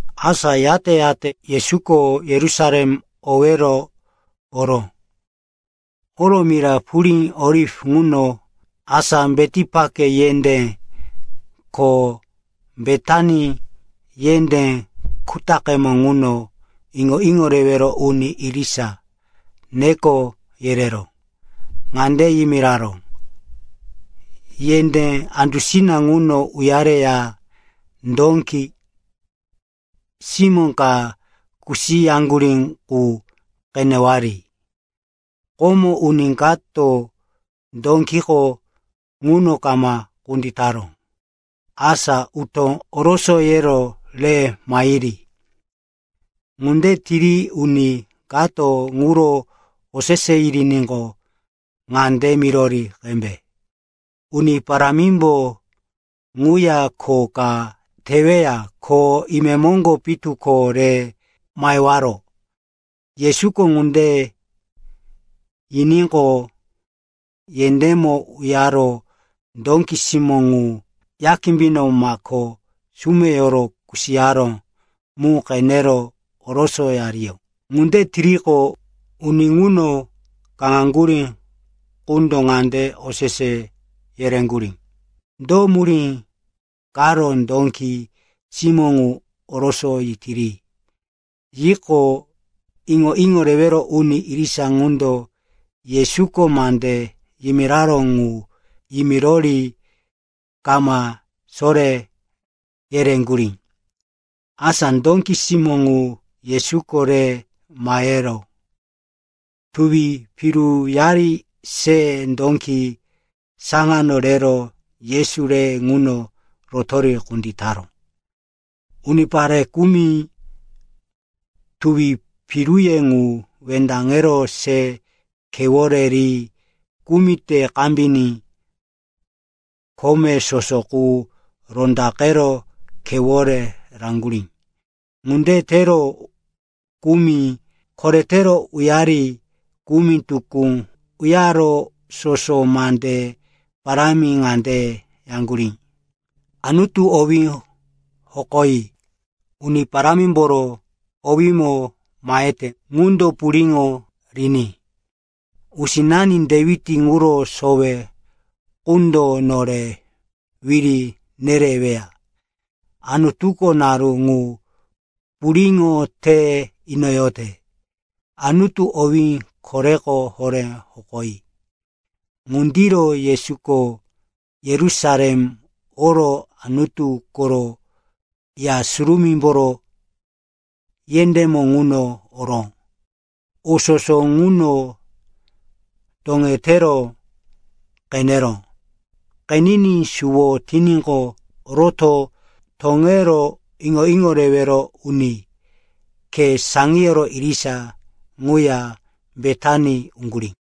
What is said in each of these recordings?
Asa yate-yate Yesuko Yerusalem owero oró. Oro mira purí Oliv ŋuno, asa Betipake yendé ko Betani yendé kutaqemo ŋuno, iŋo-iŋo rewero uni irisa neko yerero ŋande yimiraró, “Yendé andusina ŋuno uyareya dóki simó ka kusiyaŋgurí qu qenewari. Komo uni kato dókiko ŋuno kama kunditaró. Asa utó orosoyero re mahiri. Ŋunde tiri uni kato ŋuro osese yiriníqo, ŋande mirori qembe, ‘Uni Parámimbo ŋuya kho ka teweya. Ko imemoŋgo pitu ko re mahewaro.’” Yesuko ŋunde yiníqo, yendémo uyaro dóki simó ŋu ya kimbino mako sumeyoro kusiyaró mu qenero orosoyariyó. Ŋunde tiriqo, uni ŋuno kaŋaŋgurí qundo ŋande osese yereŋgurí, “Do murí karo dóki simó ŋu orosoyitiri?” Yiqo, iŋo-iŋo rewero uni irisa ŋundo Yesuko mande yimiraró ŋu yimirori kama soré yereŋgurí. Asa dóki simó ŋu Yesuko re mahero tuwi piruyari se dóki saŋano rero Yesu re ŋuno rotori kunditaró. Unipare kumi tuwi piruye ŋu wendaŋero se khewore ri, kumi te kambiní kome soso qu rondaqero khewore raŋgurí. Ŋunde tero kumi koretero uyari, kumi tukú uyaro soso mande parámi ŋande yaŋgurí, “Anutu owí hokoyi!” “Uni Parámimboro owímo mahete ŋundo puriŋo riní!” “Usinani Dewit ŋuro sowe qundo nore wiri nereweya. Anutuko naru ŋu puriŋo te inoyote!” “Anutu owí koreko horé hokoyi!” Ŋundiro Yesuko Yerusalem oro Anutu koro Ya Surumímboro yendémo ŋuno oro o soso ŋuno toŋetero qeneró. Qeniní suwo tiníqo, roto toŋero iŋo-iŋo rewero uni khe saŋiyoro irisa ŋuya Betani uŋgurí.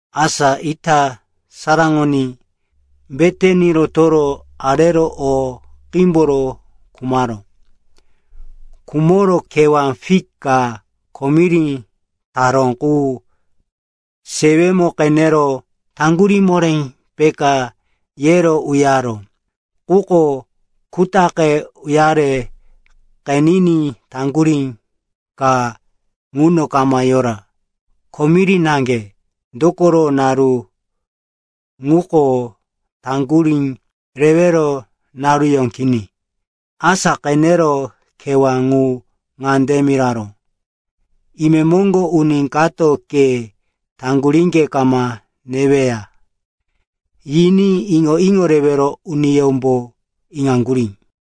Asa ita saraŋoní, Betani rotoro arero o qímboro khumaró. Khumoro kewá fik ka komiri taró qu sewemo qenero, taŋgurí moré peka, yero uyaró. Quko kutaqe uyare qeniní taŋgurí ka ŋuno kama yora, komiri naŋge. Dokoro naru ŋuko taŋgurí rewero naruyó kini. Asa qenero kewá ŋu ŋande miraró, “Imemoŋgo uni kato ke taŋguríŋge kama neweya,” yiní iŋo-iŋo rewero uniyómbo iŋaŋgurí.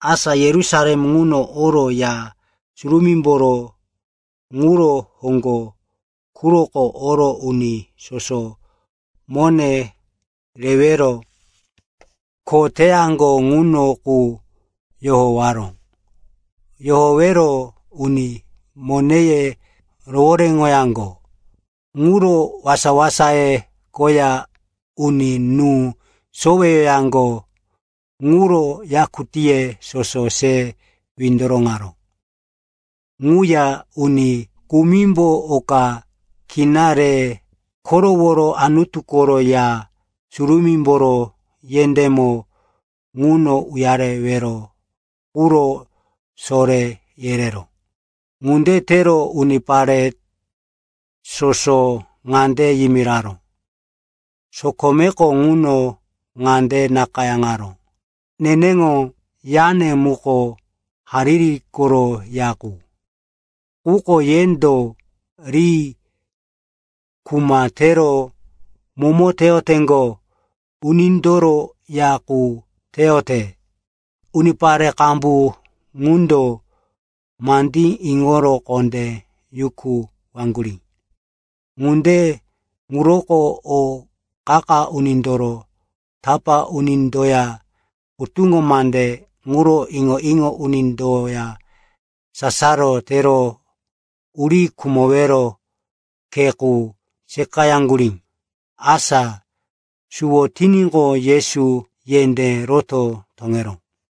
Asa Yerusalem ŋuno oro Ya Surumímboro ŋuro hoŋgo quroko oro uni soso mone rewero kho teyaŋgo ŋuno qu yohowaró. Yohowero uni moneye rohoréŋoyaŋgo ŋuro wasa-wasaye koya uni nú soweyaŋgo ŋuro yakutíye soso se windoroŋaró. Ŋuya uni kumimbo oka kina re koroworo Anutu koro Ya Surumímboro yendémo ŋuno uyarewero quro soré yereró. Ŋunde tero unipare soso ŋande yimiraró, “Sokomeko ŋuno ŋande nakayáŋaró, ‘Neneŋo yane muko hariri koro ya qu.’ Quko yendo ri ‘kuma tero momo teyoteŋgo unindoro ya qu teyote.’” Unipare qambu ŋundo mandí iŋoro kondé yukuwaŋgurí. Ŋunde ŋuroko o qa-qa unindoro tapá unindoya hutuŋo mande ŋuro iŋo-iŋo unindoya sasaro tero uri khumowero khe qu seqayaŋgurí. Asa suwo tiníqo, Yesu yendé roto toŋeró.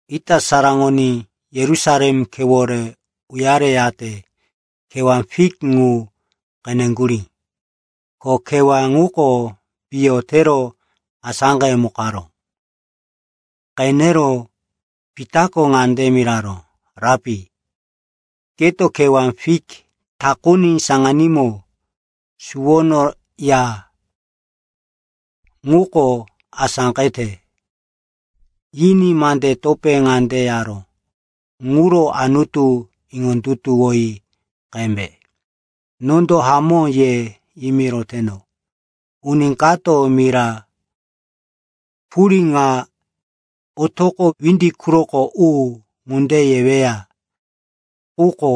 Ita saraŋoní Yerusalem khewore uyareyate kewá fik ŋu qeneŋgurí. Ko kewá ŋuko piyo tero asáqemukaró. Qenero Pitako ŋande miraró, “Rapi, keto kewá fik takuni saŋanímo suwono ya, ŋuko asáqete.” Yiní mande topé ŋande yaró, “Ŋuro Anutu iŋondutuwoyi qembe. Nondo hamó ye yimiroteno, uni kato mira purí ŋa, ‘Otoqo windi quroko u,’ ŋunde yeweya, quko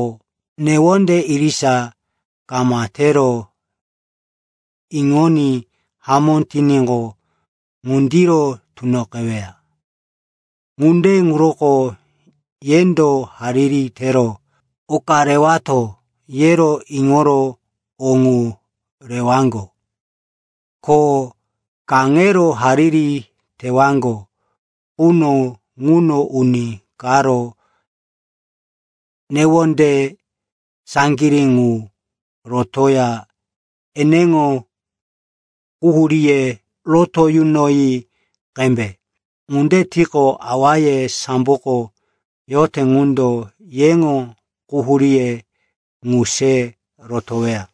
newonde irisa kama tero iŋoní hamó tiníqo, ŋundiro tunoqeweya. Ŋunde ŋuroko yendo, hariri tero oka rewato, yero iŋoro o ŋu rewaŋgo. Ko kaŋero hariri tewaŋgo quno ŋuno uni karo newonde saŋgirí ŋu rotoya eneŋo quhuríye roto yunoyi qembe. Ŋunde tiqo, awaye samboko yote ŋundo, yeŋo quhuríye ŋu se rotoweya.”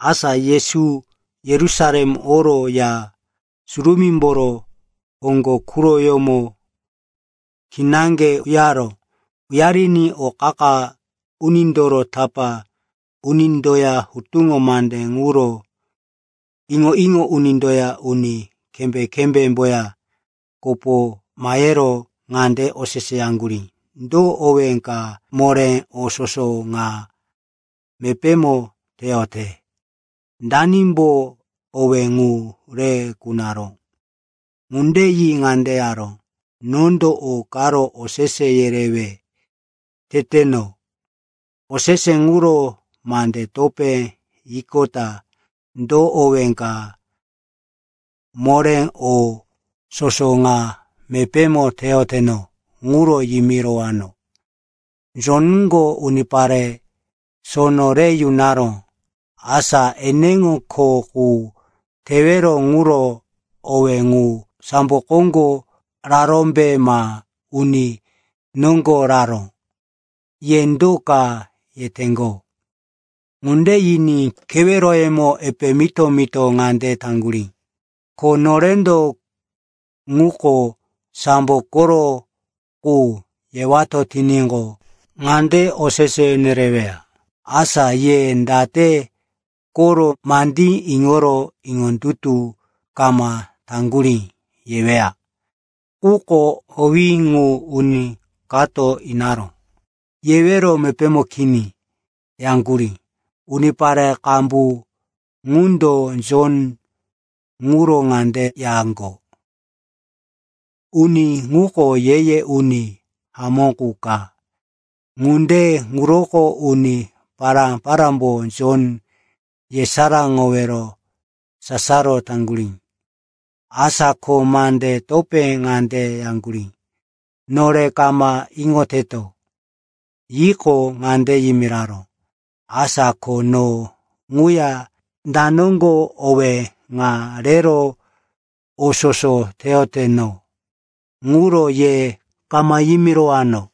Asa Yesu Yerusalem oro Ya Surumímboro hoŋgo quroyómo kinaŋge uyaró. Uyariní o qa-qa unindoro tapá unindoya hutuŋo mande ŋuro iŋo-iŋo unindoya uni kembé-kembéyemboya kopo mahero ŋande oseseyaŋgurí, “Do owé ka moré o soso ŋa mepémo teyote? Danimbo owé ŋu re kunaró?” Ŋunde yi ŋande yaró, “Nondo o karo osese yerewe teteno. Osese ŋuro mande topé yiqota do owé ka moré o soso ŋa mepémo teyoteno ŋuro yimirowano. Jonko unipare sono re yunaró. Asa eneŋo kho qu tewero ŋuro owé ŋu, sambo koŋgo rarómbe ma uni noŋgo raró? Ye do ka yeteŋgo?” Ŋunde yiní keweroyemo epe mito-mito ŋande taŋgurí, “Ko norendo, ‘Ŋuko sambo koro qu,’ yewato tiníqo, ŋande osese nereweya, ‘Asa ye date koro mandí iŋoro iŋondutu kama taŋgurí?’ yeweya. Quko, ‘Owí ŋu uni kato inaró,’ yewero mepémo kini,” yaŋgurí. (Unipare qambu ŋundo Jon ŋuro ŋande yaŋgo, “Uni ŋuko ye-ye uni hamó qu ka.” Ŋunde ŋuroko uni pará-parámbo Jon yesaráŋowero sasaro taŋgurí.) Asa ko mande topé ŋande yaŋgurí, “Nore kama iŋoteto.” Yiqo, ŋande yimiraró, “Asa ko no ŋuya da noŋgo owé ŋa rero o soso teyoteno ŋuro ye kama yimirowano.”